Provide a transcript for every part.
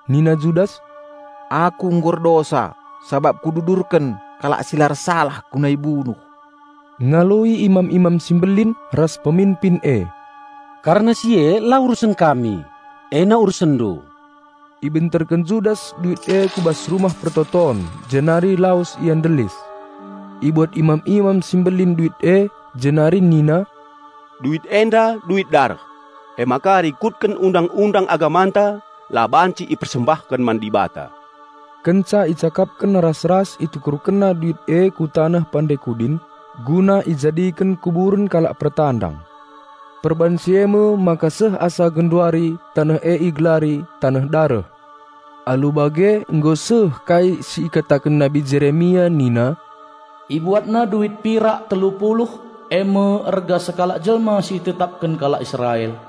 Nina Judas, "Aku nggo erdosa sabap kududurken kalak si la ersalah guna ibunuh." Ngaloi imam-imam si mbelin ras peminpin e, "Kerna si e urusen kami. E urusendu kap." Ibenterken Judas duit e ku bas Rumah Pertoton, jenari lawes ia ndelis. Ibuat imam-imam si mbelin duit e, jenari nina, "Duit enda duit dareh, emaka rikutken Undang-undang agamanta la banci ipersembahken man Dibata." Kenca icakapken ras-ras itukurkenna duit e ku Taneh Pande Kudin, guna ijadiken kuburen kalak pertandang. Perbahan si eme maka seh asa genduari taneh e igelari 'Taneh Dareh'. Alu bage nggo seh kai si ikataken Nabi Jeremia nina, "Ibuatna duit pirak telu puluh, eme erga sekalak jelma si ibahan kalak Israel,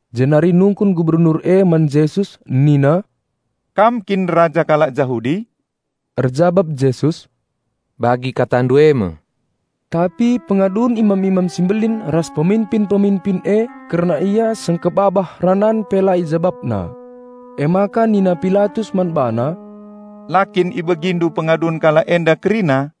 Jenari nungkun Gubernur man Jesus si tedis i lebe-lebena nina, "Kam kin Raja kalak Jahudi?" Erjabap Jesus, "Bagi katandu e me." Tapi pengadun imam-imam si mbelin ras peminpin-peminpin e kerna Ia sengkebabah ranan pe la IjabapNa. Emaka nina Pilatus man BaNa, "La kin ibegindu pengadun kalak enda kerina?"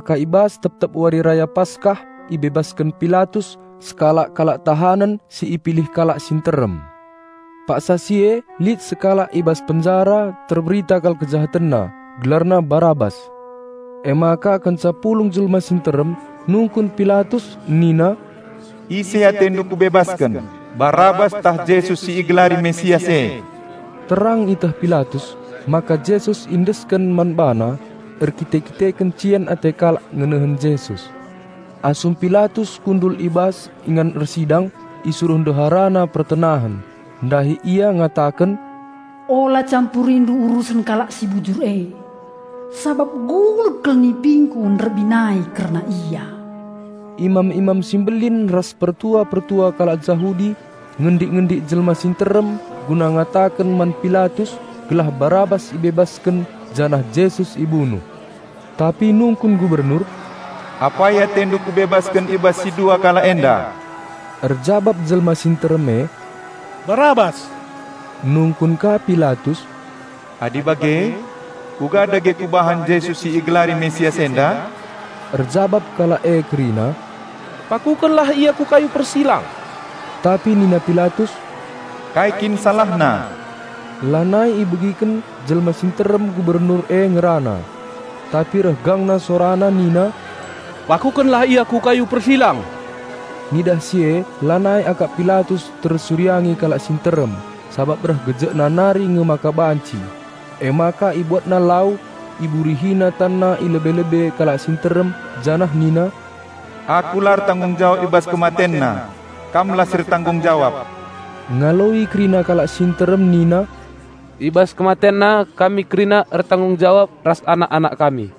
Nggo jadi kebiasan maka i bas tep-tep Wari Raya Paskah ibebasken Pilatus sekalak kalak tahanen si ipilih kalak si nterem. Paksa si e lit sekalak i bas penjara terberita kal kejahatenna, gelarna Barabas. Emaka kenca pulung jelma si nterem nungkun Pilatus nina, "Ise atendu kubebasken, Barabas ntah Jesus si igelari Raja Penampat e?" Terang ieteh Pilatus maka Jesus iendesken man bana erkite-kiteken cian ate kalak ngenehen Jesus. Asum Pilatus kundul i bas ingan ersidang, isuruh ndeharana pertenahen, ndahi ia ngataken, "Ola campurindu urusen kalak si bujur e, sabap gulut kal nipingku nderbinai kerna Ia." Imam-imam si mbelin ras pertua-pertua kalak Jahudi ngendik-ngendik jelma si nterem guna ngataken man Pilatus gelah Barabas ibebasken janah Jesus ibunuh. Tapi nungkun Gubernur, "Apai atendu kubebasken i bas si dua kalak enda?" Erjabap jelma si nterem e, "Barabas!" Nungkun ka Pilatus, "Adi bage, kuga dage kubahan Jesus si igalari Raja Penampat enda?" Erjabap kalak e kerina, "Pakukenlah Ia ku kayu persilang!" Tapi nina Pilatus, "Kai kin SalahNa?" Lanai ibegiken jelma si nterem Gubernur e ngerana. Tapi reh gangna sorana nina, "Pakukenlah Ia ku kayu persilang!" Ngidah si e lanai akap Pilatus tersuriangi kalak si nterem sabap reh gejekna nari nge maka banci, emaka ibuatna lau, iburihina tanna i lebe-lebe kalak si nterem janah nina, "Aku la ertanggung jawab i bas KematenNa! Kamlah si ertanggung jawab!" Ngaloi kerina kalak si nterem nina, "I bas KematenNa kami kerina ertanggung jawab ras anak-anak kami."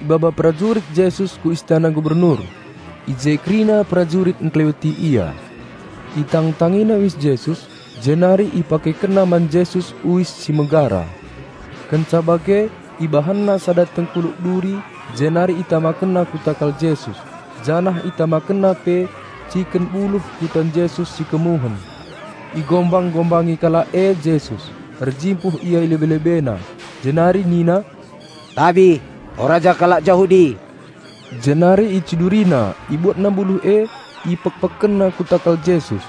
Ibaba perajurit Jesus ku istana gubernur, ije kerina perajurit engkeleweti Ia. Itangtangina uis Jesus, jenari ipakekenna man Jesus uis si megara. Kenca bage ibahanna sada tengkuluk duri jenari itamakenna ku takal Jesus janah itamakenna pe ciken buluh ku tan Jesus si kemuhen. Igombang-gombangi kalak e Jesus, erjimpuh ia i lebe-LebeNa, jenari nina, "Tabi, o Raja kalak Jahudi!" Jenari icidurina, ibuatna buluh e, ipekpekkenna ku takal Jesus.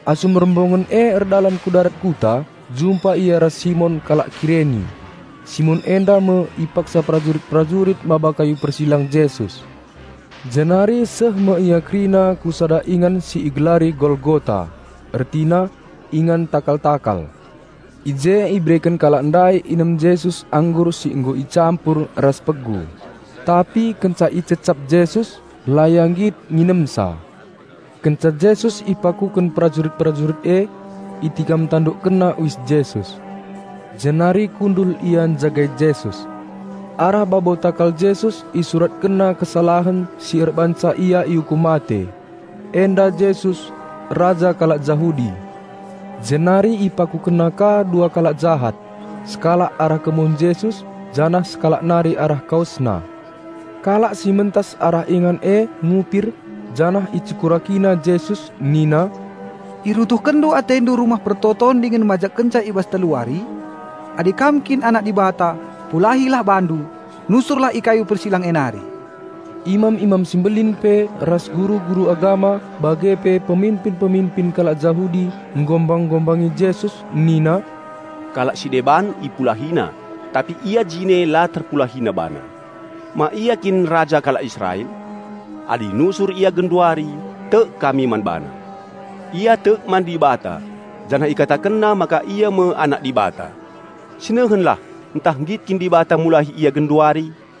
Asum rombongen e erdalan ku darat kuta, jumpa ia ras Simon kalak Kireni. Simon enda me ipaksa perajurit-perajurit maba kayu persilang Jesus. Jenari seh me ia kerina ku sada ingan si igelari Golgota, ertina: "Ingan takal-takal". I je ibereken kalak ndai inem Jesus anggur si nggo icampur ras pegu; tapi kenca icecap Jesus, la Ia nggit nginemsa. Kenca Jesus ipakuken perajurit-perajurit e, itikam-tandukkenna uis Jesus. Jenari kundul ia njagai Jesus. Arah babo takal Jesus isuratkenna kesalahen si erbahanca Ia iukum mate: "Enda Jesus, Raja kalak Jahudi". Jenari ipakukenna ka dua kalak jahat, sekalak arah kemuhen Jesus, janah sekalak nari arah KawesNa. Kalak si mentas arah ingan e ngupir, janah icekurakina Jesus nina, "IruntuhkenNdu AteNdu Rumah Pertoton dingen majekkenca i bas telu wari! Adi Kam kin Anak Dibata, pulahilah BaNdu. Nusurlah i kayu persilang e nari!" Imam-imam si mbelin pe ras guru-guru agama bage pe peminpin-peminpin kalak Jahudi nggombang-gombangi Jesus nina, "Kalak si deban IpulahiNa tapi Ia jine la TerpulahiNa BaNa. Ma Ia kin Raja kalak Israel? Adi nusur Ia genduari, tek kami man BaNa! Ia tek man Dibata janah IkatakenNa maka Ia me Anak Dibata. Sinehenlah ntah nggit kin Dibata mulahi Ia genduari."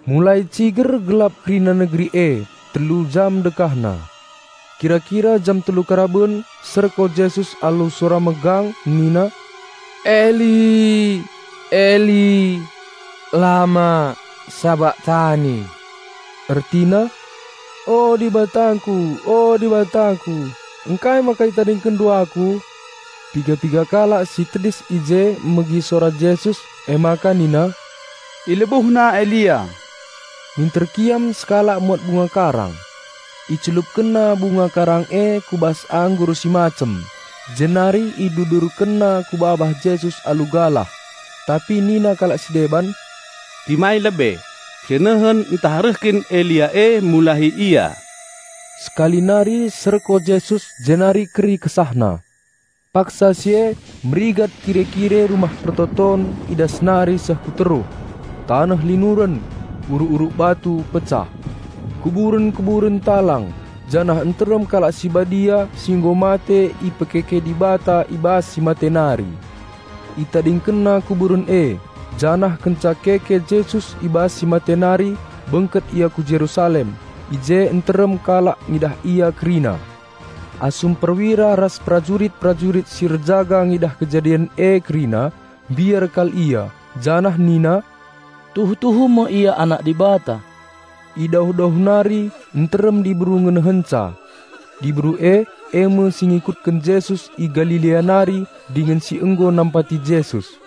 Mulai ciger gelap kerina negeri e, telu jam dekahna. Kira-kira jam telu karaben serko Jesus alu sora megang, nina, "Eli, Eli, lama sabakhtani?" ertina: "O, DibatangKu, o, DibatangKu, ngkai maka ItadingkenNdu Aku?" Piga-piga kalak si tedis i je megi sora Jesus, emaka nina, "IlebuhNa Elia!" Minter kiam sekalak muat bunga karang. Icelupkenna bunga karang e ku bas anggur si macem, jenari idudurkenna ku babah Jesus alu galah. Tapi nina kalak si deban, "Timai lebe, sinehen ntah reh kin Elia e mulahi Ia!" Sekali nari serko Jesus jenari keri KesahNa. Paksa si e merigat kire-kire Rumah Pertoton i datas nari seh ku teruh. Taneh linuren, uruk-uruk batu pecah, kuburen-kuburen talang, janah nterem kalak si badia si nggo mate ipekeke Dibata i bas si mate nari. Itadingkenna kuburen e; janah kenca keke Jesus i bas si mate nari bengket ia ku Jerusalem; i je nterem kalak ngidah ia kerina. Asum perwira ras perajurit-perajurit si erjaga ngidah kejadin e kerina, mbiar kal ia, janah nina, "Tuhu-tuhu me Ia Anak Dibata." I dauh-dauh nari nterem diberu ngenehenca. Diberu e, eme si ngikutken Jesus i Galilea nari dingen si nggo nampati Jesus.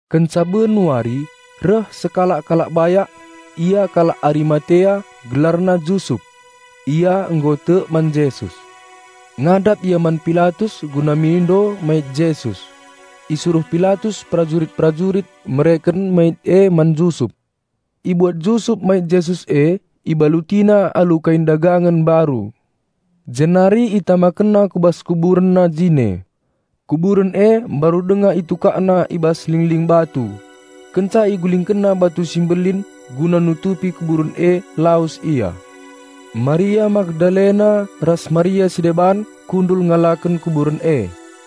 Kenca ben wari, reh sekalak kalak bayak; ia kalak Arimatea, gelarna Jusup. Ia nggo tek man Jesus. Ngadap ia man Pilatus guna mindo mait Jesus. Isuruh Pilatus perajurit-perajurit mereken mait e man Jusup. Ibuat Jusup mait Jesus e, ibalutina alu kain dagangen mbaru, jenari itamakenna ku bas kuburenna jine. Kuburen e mbaru denga itukakna i bas lingling batu. Kenca igulingkenna batu si mbelin guna nutupi kuburen e lawes ia. Maria Magdalena ras Maria si deban kundul ngalaken kuburen e.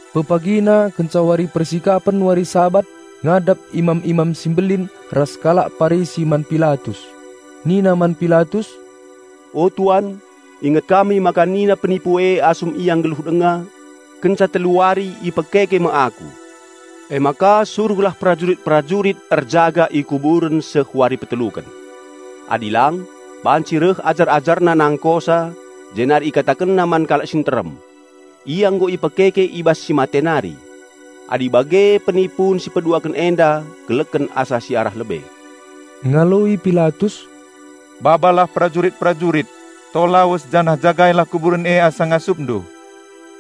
Pepagina kenca wari persikapen wari Sabat ngadap imam-imam si mbelin ras kalak Parisi man Pilatus. Nina man Pilatus, "O tuan, inget kami maka nina penipu e asum Ia nggeluh denga, 'Kenca telu wari ipegeluh Dibata me Aku mulihi.' Emaka suruhlah perajurit-perajurit erjaga i kuburen seh wari peteluken. Adi lang, banci reh ajar-AjarNa nangkosa jenari ikatakenna man kalak si nterem, 'Ia nggo ipegeluh Dibata mulihi.' Adi bage penipun si peduaken enda keleken asa si arah lebe." Ngaloi Pilatus, "Babalah perajurit-perajurit, to lawes janah jagailah kuburen e asa ngasupndu."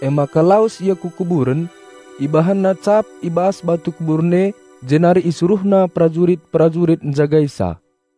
Emaka lawes ia ku kuburen, ibahanna cap i bas batu kuburen e jenari isuruhna perajurit-perajurit njagaisa.